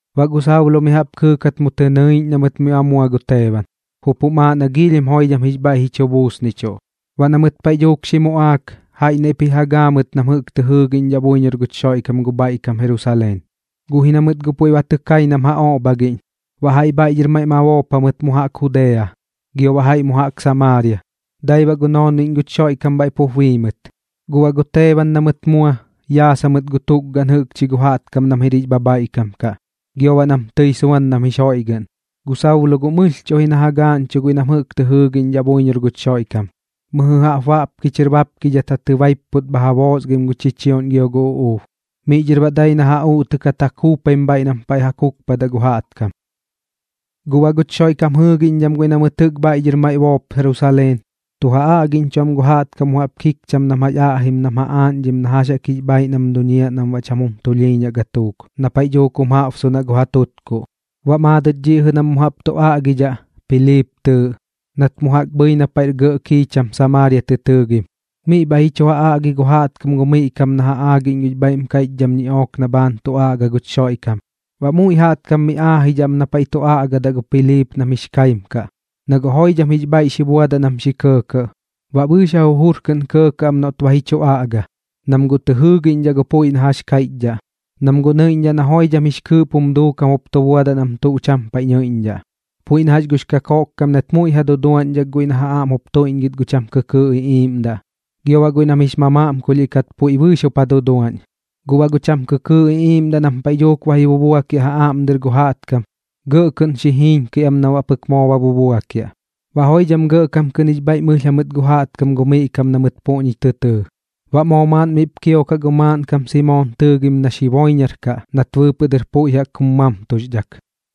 Baꞌ gu Saulo mi jaꞌp kɨɨkat mu tɨ nɨiꞌñ na mɨt miꞌ ba mua gu Teeban, jup jum aaꞌ na giilhim joidham jix bhaiꞌ ji chu buusnichuꞌ. Baꞌ gatuuk na mɨt xi muꞌaak, jaiꞌ naiꞌp ji ja gaa mɨt bɨɨx nam jɨꞌk tɨ jɨɨgiꞌñdhaꞌ buiñor guch Xoiꞌkam gu bhaiꞌ kam Jerusaleen. Guꞌ ji na mɨt guꞌ puiꞌ ba tɨ kai nam ja oꞌbhagiꞌñ, baꞌ jaiꞌ bhaiꞌ dhɨr maiꞌ ma boop jamɨt mu jaꞌk Judea, gio baꞌ jaiꞌ mu jaꞌk Samaaria. Dai baꞌ gu noonbiꞌñ guch Xoiꞌkam bhaiꞌ pup bii mɨt. Guꞌ baꞌ gu Teeban na mɨt mua, yaas jamɨt gu tukgaꞌn jɨꞌkchi gu jaꞌtkam nam jir jix bhabhaiꞌkam kaꞌ, gio baꞌ nam tɨi suan nam jix joiꞌgɨꞌn. Gu Saulo guꞌ mɨlhchuꞌ ji na ja gaaꞌñchuꞌ guiꞌ nam jɨꞌk tɨ jɨɨgiꞌñ buiñor guch Xoiꞌkam, mɨjɨ jaꞌp baꞌpki chɨr baapkidhat ja tɨbaipput bha ja boosgaim gu chichioꞌñ gio gu uꞌuub. Miꞌ dhɨr baꞌ dai na ja uꞌtɨkat ja kuupaim bhaiꞌ nam paiꞌ ja kukpadaꞌ gu jaꞌtkam. Guꞌ baꞌ guch Xoiꞌkam jɨɨgiꞌñdham guiꞌ na mɨt jɨꞌk bhaiꞌ dhɨr maiꞌ boop Jerusaleen, tu ja aꞌgiꞌñchuꞌ am gu jaꞌtkam mu jaꞌp kikcham nam jax aꞌjim nam ja aaꞌñdhim na jax jaꞌk jix bhaaiꞌ nam duñiaꞌ nam baꞌ cham jum tulhiiñaꞌ gatuuk, na paiꞌ dhuuk jaꞌbsunaꞌ gu ja tutkuꞌ. Baꞌ maadɨt dhiꞌ jɨꞌ nam mu jaꞌp tu aꞌgidhaꞌ, Piliip tɨɨꞌ, nat mu jaꞌk bhɨi na paiꞌr gɇꞌ kiicham Samaaria tɨ tɨɨgim. Miꞌ bhaiꞌ ji chu ja aꞌgi gu jaꞌtkam gu miꞌ kam na ja aagiꞌñ gux bhaiꞌm kaiꞌchdham ñiꞌook na bhaan tu aꞌgaꞌ guch Xoiꞌkam. Baꞌ muiꞌ jaꞌtkam mi aajidhaꞌ am miꞌ na paiꞌ tu aꞌgadaꞌ gu Piliip nam jix kaim kaꞌ, na guꞌ joidham jix bhaiꞌ xi buadaꞌ nam xi kɇɇkɇꞌ. Baꞌ bɨɨx ja jujur kɨꞌn kɇɇkɇꞌ am noꞌt ba ji chu aꞌga, nam guꞌ tɨ jɨɨgiꞌñdhaꞌ gu puiꞌ na jax kaiꞌchdhaꞌ, nam guꞌ nɨiꞌñdhaꞌ na joidham jix kɨɨꞌp jum duukam jup tu buadaꞌ nam tuꞌ cham paiꞌ nɨiꞌñdhaꞌ. Puiꞌ na jax gux kakoꞌkkam nat muiꞌ ja duduaꞌñdhak guiꞌ na ja aꞌm jup tuiꞌñgɨt gu cham kɨkɨɨꞌ iꞌiiꞌmdaꞌ, gio baꞌ guiꞌ nam jix mamaꞌmkulhiꞌ kat puiꞌ bɨɨx jup ja duduaꞌñ ɨp. Guꞌ baꞌ gu cham kɨkɨɨꞌ iꞌiiꞌmdaꞌ nam paiꞌ dhuuk ba ji bubuakiaꞌ ja aꞌm dɨr gu jaꞌtkam, gɇꞌ kɨꞌn xi jiiñkɨi am nam baꞌ pɨk moo ba bubuakiaꞌ. Baꞌ joidham gɇꞌkam kɨꞌn jix bhaiꞌm ɨlh jamɨt gu jaꞌtkam gu miꞌ kam na mɨt puꞌñi tɨ tɨɨ. Baꞌ moo maaꞌn miꞌp kiokaꞌ gu maaꞌnkam Simoon tɨɨgim nax jiboiñaraꞌ kaꞌ nat bɨɨpɨꞌ dɨr puiꞌ jaꞌk jum mamtuxdhak.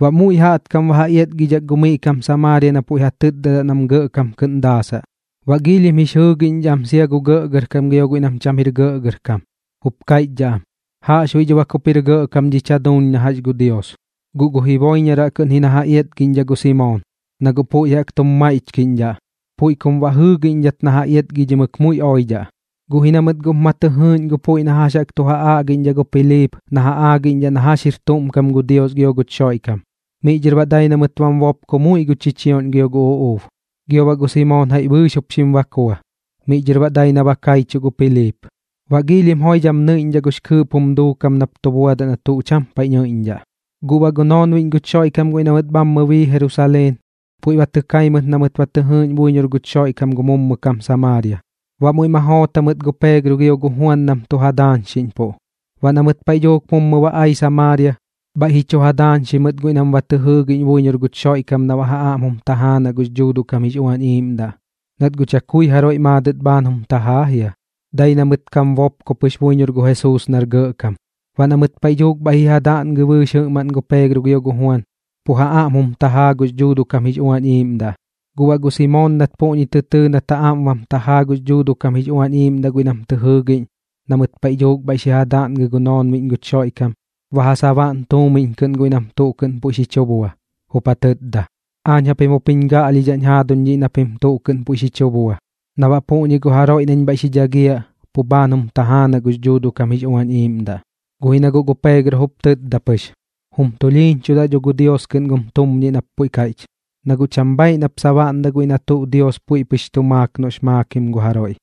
Baꞌ muiꞌ jaꞌtkam ba ja iatgidhak gu miꞌ kam Samaaria na puiꞌ ja tɨtdadaꞌ nam gɇꞌkam kɨꞌn daasaꞌ. Baꞌ giilhim jix jɨɨgiꞌñdhaꞌ am sia gu gɇꞌgɇrkam gio guiꞌ nam cham jir gɇꞌgɇrkam, jup kaiꞌchdhaꞌ am: ―Jaꞌxbuiꞌ dho bak jup jir gɇꞌkam dhich jaduuñ na jax gu Dios. Guꞌ gu jiboiñaraꞌ kɨꞌn ji na ja iatgiꞌñdhaꞌ gu Simoon, na guꞌ puiꞌ jaꞌk tum maiꞌchkiꞌñdhaꞌ, puiꞌ kum baꞌ jɨɨgiꞌñdhat na ja iatgidhimɨk muiꞌ oidhaꞌ. Guꞌ ji na mɨt guꞌp ma tɨ jɨɨꞌñ gu puiꞌ na jax jaꞌk tu ja aꞌgiꞌñdhaꞌ gu Piliip na ja aagiꞌñdhaꞌ na jax jir tuꞌm kam gu Dios gio guch Xoiꞌkam, miꞌ dhɨr baꞌ dai na mɨt bam bopko muiꞌ gu chichioꞌñ gio gu uꞌuub. Gio baꞌ gu Simoon jaiꞌ bɨɨx jup xim bakua, miꞌ dhɨr baꞌ dai na ba kaichuꞌ gu Piliip. Baꞌ giilhim joidham nɨiꞌñdhaꞌ gux kɨɨꞌp jum duukam nap tu buadaꞌ na tuꞌ cham paiꞌ nɨiꞌñdhaꞌ. Gu baꞌ gu noonbiꞌñ guch Xoiꞌkam guiꞌ na mɨt bhammɨ bii Jerusaleen puiꞌ ba tɨ kai mɨt na mɨt ba tɨ jɨɨꞌñ buiñor guch Xoiꞌkam gu mummɨ kam Samaaria. Baꞌ muiꞌ ma joot jamɨt gu Peegro gio gu Juan nam tu ja daañxiꞌñpuꞌ. Baꞌ na mɨt paiꞌ dhuuk mummɨ ba ai Samaaria, bhaiꞌ ji chu ja daañxi mɨt guiꞌ nam ba tɨ jɨɨgiꞌñ buiñor guch Xoiꞌkam na baꞌ ja aꞌm jum tajaanaꞌ gux Dhuuduꞌ kam jix Uañ Iiꞌmdaꞌ. Nat guꞌ chakui jaroiꞌ maadɨt bhaan jum tajaa jia, dai na mɨt kam bopko pɨx buiñor gu Jesuus nar gɇꞌkam. Baꞌ na mɨt paiꞌ dhuuk bhaiꞌ xi ja daꞌngɨ bɨɨx jɨꞌmaꞌn gu Peegro gio gu Juan, pu ja aꞌm jum tajaa gux Dhuuduꞌ kam jix Uañ Iiꞌmdaꞌ. Guꞌ baꞌ gu Simoon nat puꞌñi tɨ tɨɨ nat ja aꞌm bam tajaa gux Dhuuduꞌ kam jix Uañ Iiꞌmdaꞌ guiꞌ nam jɨꞌk tɨ jɨɨgiꞌñ na mɨt paiꞌ dhuuk bhaiꞌ xi ja daꞌngɨ gu noonbiꞌñ guch Xoiꞌkam, ba ja sabaꞌn tuumiñ kɨꞌn guiꞌ nam tuꞌ kɨꞌn puiꞌ xi chu bua, jup ja tɨtda: ―Aañ japim jup jiñ gaꞌlhidhaꞌñ jaaduñ dhiꞌ na pim tuꞌ kɨꞌn puiꞌ xi chu bua, na baꞌ puꞌñi gu jaroiꞌ nañ bhaiꞌ xi dhagiaꞌ, pu bhaan jum tajaanaꞌ gux Dhuuduꞌ kam jix Uañ Iiꞌmdaꞌ. Guꞌ ji na guꞌ gu Peegro jup tɨtda pɨx: ―Jum tulhiiñchudaꞌ dho gu Dios kɨꞌn gum tumñiꞌ nap puiꞌ kaiꞌch. Na guꞌ cham bhaaiꞌ nap sabaꞌndaꞌ guiꞌ na tuꞌ Dios puiꞌ pɨx tu maak noꞌx maakim gu jaroiꞌ.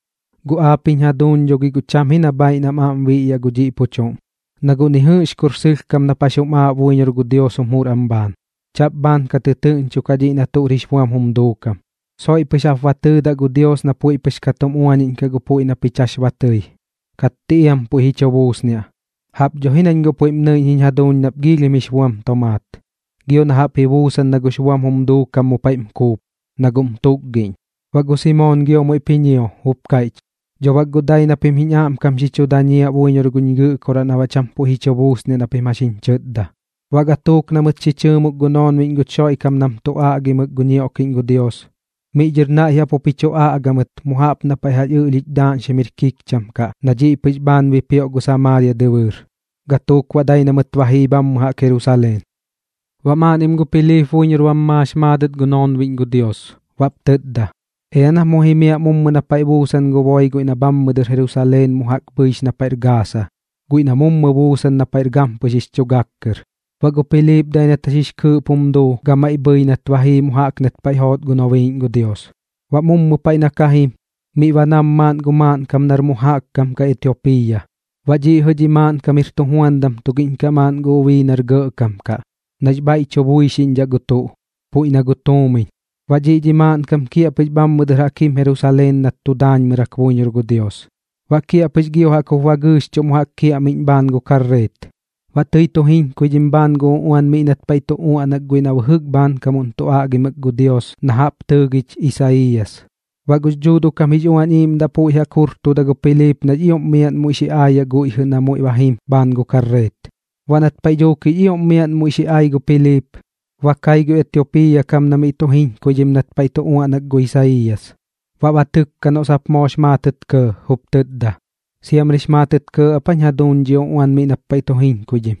Guꞌ aap jiñ jaduuñ dho gi guꞌ cham ji na bhaaiꞌ nam aꞌm biꞌyaꞌ gu dhiꞌ pu chuꞌm, na guꞌ ni jɨꞌx kur sɨlhkam nap jax jum aaꞌ buiñor gu Dios jum jur am bhaan. Chaꞌp bhaan ka tɨtɨɨꞌñchukaꞌ dhiꞌ na tuꞌr jix buam jum duukam. Soiꞌ pɨx jap ba tɨɨdaꞌ gu Dios na puiꞌ pɨx ka tum uañiꞌñkaꞌ gu puiꞌ na pich jax ba tɨi, katti iam puiꞌ ji chu buusniaꞌ. Jaꞌp dho ji nañ guꞌ puiꞌm nɨiꞌñ jiñ jaduuñ nap giilhim jix buam tomaat, gio na jaꞌp ji buusan na gux buam jum duukam mu paiꞌm kuup, na guꞌm tukgiꞌñ. Baꞌ gu Simoon giop muiꞌp ji ñio, jup kaiꞌch: ―Dho bak guꞌ dai na pim jiñ aꞌmkam xi chu dañiaꞌ buiñor guch Gɨꞌkoraꞌ na baꞌ cham puiꞌ ji chu buusniaꞌ na pim jax jiñ chɨtda. Baꞌ gatuuk na mɨt xi chɨɨmuk gu noonbiꞌñ guch Xoiꞌkam nam tu aꞌgimɨk gu ñioꞌkiꞌñ gu Dios, miꞌ dhɨr naiꞌ jaꞌp jup ji chu aꞌga mɨt mu jaꞌp na paiꞌ ɨꞌlhich daaꞌñxim jir kikcham kaꞌ na dhiꞌ pɨx bhaan bipioꞌ gu Samaaria dɨbɨɨr. Gatuuk baꞌ dai na mɨt ba jii bhammɨ jaꞌk Jerusaleen. Baꞌ maaꞌnnim gu Piliip buiñor bam maax maadɨt gu noonbiꞌñ gu Dios, baꞌp tɨtda: ―Ea nap mu jimiaꞌ mummɨ na paiꞌ buusan gu boi guiꞌ na bhammɨ dɨr Jerusaleen mu jaꞌk bhɨix na paiꞌr Gaasa, guiꞌ na mummɨ buusan na paiꞌr gampɨx jix chu gak kɨr. Baꞌ gu Piliip dai nat jax jix kɨɨꞌp jum duu gamaiꞌ bhɨi nat ba jii mu jaꞌk nat paiꞌ joot gu nobiiꞌñ gu Dios. Baꞌ mummɨ paiꞌ na ka jim, miꞌ ba nam maaꞌn gu maaꞌnkam nar mu jaꞌk kam kaꞌ Etiopiiya. Baꞌ dhiꞌ jɨꞌ dhi maaꞌnkam jir tujuandam tugiꞌñ kaꞌ maaꞌn gu ubii nar gɇꞌkam kaꞌ, nax bhaiꞌ tu buixiꞌñdhaꞌ gu tuꞌ, puiꞌ na gu tuumiñ. Baꞌ dhiꞌ dhi maaꞌnkam kiaꞌpɨx bhammɨ dɨr jaꞌk jim Jerusaleen nat tu daañmɨrak buiñor gu Dios. Baꞌ kiaꞌpɨx gio jaꞌk jup ba gɨɨxchuꞌ mu jaꞌk kiaꞌmiꞌñ bhaan gu karreet. Baꞌ tɨi tu jiñkuidhim bhaan gu uꞌuan miꞌ nat paiꞌ tu uaꞌnak guiꞌ na bɨjɨk bhaankam tu aꞌgimɨk gu Dios na jaꞌp tɨɨgich Isaiiyas. Baꞌ gux Dhuuduꞌ kam jix Uañ Iiꞌmdaꞌ puiꞌ jaꞌk xi jurtuda gu Piliip nax ioꞌm miaꞌn muiꞌ xi aayaꞌ guiꞌ jɨꞌ na muiꞌ ba jim bhaan gu karreet. Baꞌ nat paiꞌ dhuuk jix ioꞌm miaꞌn muiꞌ xi ai gu Piliip, ba kai gu Etiopiiya kam na miꞌ tu jiñkuidhim nat paiꞌ tu uaꞌnak gu Isaiiyas. Baꞌ ba tɨkka noꞌ sap moox maatɨt kɇɇ, jup tɨtda: ―¿Siamrix maatɨt kɇɇ ap aa jiñ jaduuñ dhi uꞌuan miꞌ nap paiꞌ tu jiñkuidhim?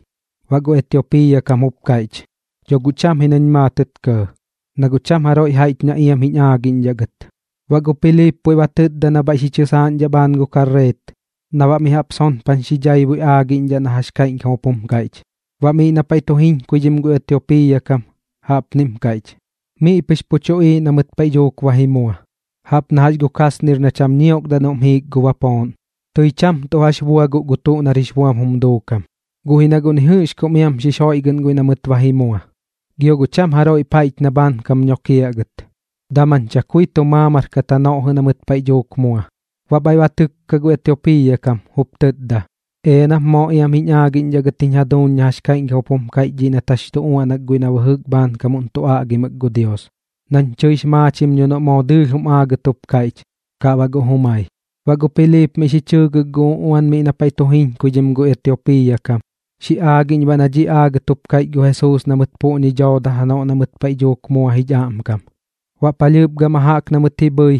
Baꞌ gu Etiopiiya kam jup kaiꞌch: ―Dho guꞌ cham ji nañ maatɨt kɇɇ, na guꞌ cham jaroiꞌ jaiꞌch na iam jiñ aagiꞌñdhaꞌ gɨt. Baꞌ gu Piliip puiꞌ ba tɨtda na bhaiꞌ xi chɨsaaꞌñdhaꞌ bhaan gu karreet na baꞌ mi jaꞌp sonpan xi dhaibui aagiꞌñdhaꞌ na jax kaiꞌñkam jup jum kaiꞌch. Baꞌ miꞌ na paiꞌ tu jiñkuidhim gu Etiopiiya kam, jaꞌpnim kaiꞌch: Miꞌ pɨx pu tuꞌiiꞌ na mɨt paiꞌ dhuuk ba ji mua, jaꞌp na jax gu kasnir na cham ñiokdaꞌ noꞌm jiik gu bapooꞌn. Tɨi cham tuꞌ jax bua guꞌ gu tuꞌ nar jix buam jum duukam, guꞌ ji na guꞌ ni jɨꞌx kum iam xix joiꞌgɨꞌn guiꞌ na mɨt ba ji mua. Gio guꞌ cham jaroiꞌp jaiꞌch na bhaankam nokiaꞌ gɨt, daman chakui tu maamar kat janoꞌ jɨꞌ na mɨt paiꞌ dhuuk mua. Baꞌ bhaiꞌ ba tɨkka gu Etiopiiya kam, jup tɨtda: ―Ea nap moo iam jiñ aagiꞌñdhaꞌ gɨt jiñ jaduuñ na jax kaiꞌñkam jup jum kaiꞌch dhiꞌ nat jax chu uaꞌnak guiꞌ na bɨjɨk bhaankam tu aꞌgimɨk gu Dios, nañ tɨix maachim dho noꞌ moo dɨɨlh jum aagɨt jup kaiꞌch, kaꞌ baꞌ guꞌ jumai. Baꞌ gu Piliip miꞌ xi chɨɨgɨk gu uꞌuan miꞌ na paiꞌ tu jiñkuidhim gu Etiopiiya kam, xi aagiꞌñ baꞌ na dhiꞌ aagat jup kaiꞌch gu Jesuus na mɨt puꞌñi dhooda janoꞌ na mɨt paiꞌ dhuuk mua aach jich aꞌmkam. Baꞌ palhɨɨp gama jaꞌk na mɨt ji bhɨi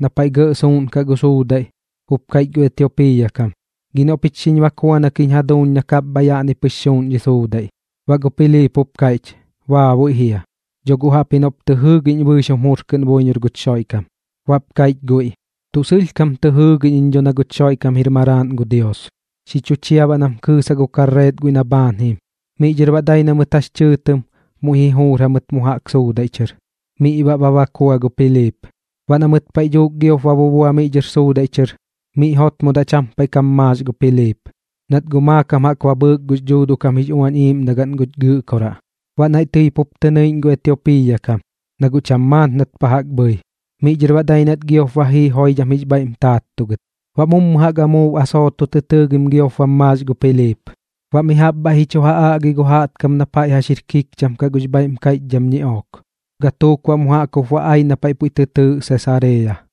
na paiꞌ gɇꞌ suuꞌnkaꞌ gu suudaiꞌ, jup kaiꞌch gu Etiopiiya kam: ―Gi noꞌ pich xiñ bakuanak jiñ jaduuñ na kapbhaiꞌ na yaꞌni pɨx suuꞌn dhi suudaiꞌ. Baꞌ gu Piliip jup kaiꞌch: ―Baabuiꞌ jia. Dho guꞌ jaꞌpji noꞌp tɨ jɨɨgiꞌñ ji bɨɨx jum jur kɨꞌn buiñor guch Xoiꞌkam. Baꞌp kaiꞌch guiꞌ: ―Tuꞌ sɨlhkam tɨ jɨɨgiꞌñ iñ dho na guch Xoiꞌkam jir Maraaꞌn gu Dios. Xi chu chia baꞌ nam kɨɨsaꞌ gu karreet guiꞌ na bhaan jim. Miꞌ dhɨr baꞌ dai na mɨt jax chɨɨtɨm muiꞌ ji juur jamɨt mu jaꞌk suudaiꞌ chɨr, miꞌ baꞌ ba bakua gu Piliip. Baꞌ na mɨt paiꞌ dhuuk giop ba bubua miꞌ dhɨr suudaiꞌ chɨr, miꞌ jotmodaꞌ cham paiꞌ kam maax gu Piliip, nat guꞌ maakam jaꞌk ba bhɨɨk gux Dhuuduꞌ kam jix Uañ Iiꞌmdagaꞌn guch Gɨꞌkoraꞌ. Baꞌ naiꞌ tɨi pup tɨ nɨiꞌñ gu Etiopiiya kam, na guꞌ cham maat nat pa jaꞌk bhɨi. Miꞌ dhɨr baꞌ dai nat giop ba jii joidham jix bhaiꞌm taattugɨt. Baꞌ mummɨ jaꞌk amuub Asooto tɨ tɨɨgim giop bam maax gu Piliip. Baꞌ mi jaꞌp bhaiꞌp ji chu ja aꞌgi gu jaꞌtkam na paiꞌ jax jir kikcham kaꞌ gux bhaiꞌm kaiꞌchdham ñiꞌook. Gatuuk baꞌ mu jaꞌk jup ba ai na paiꞌ puiꞌ tɨ tɨɨꞌ Sesareeya.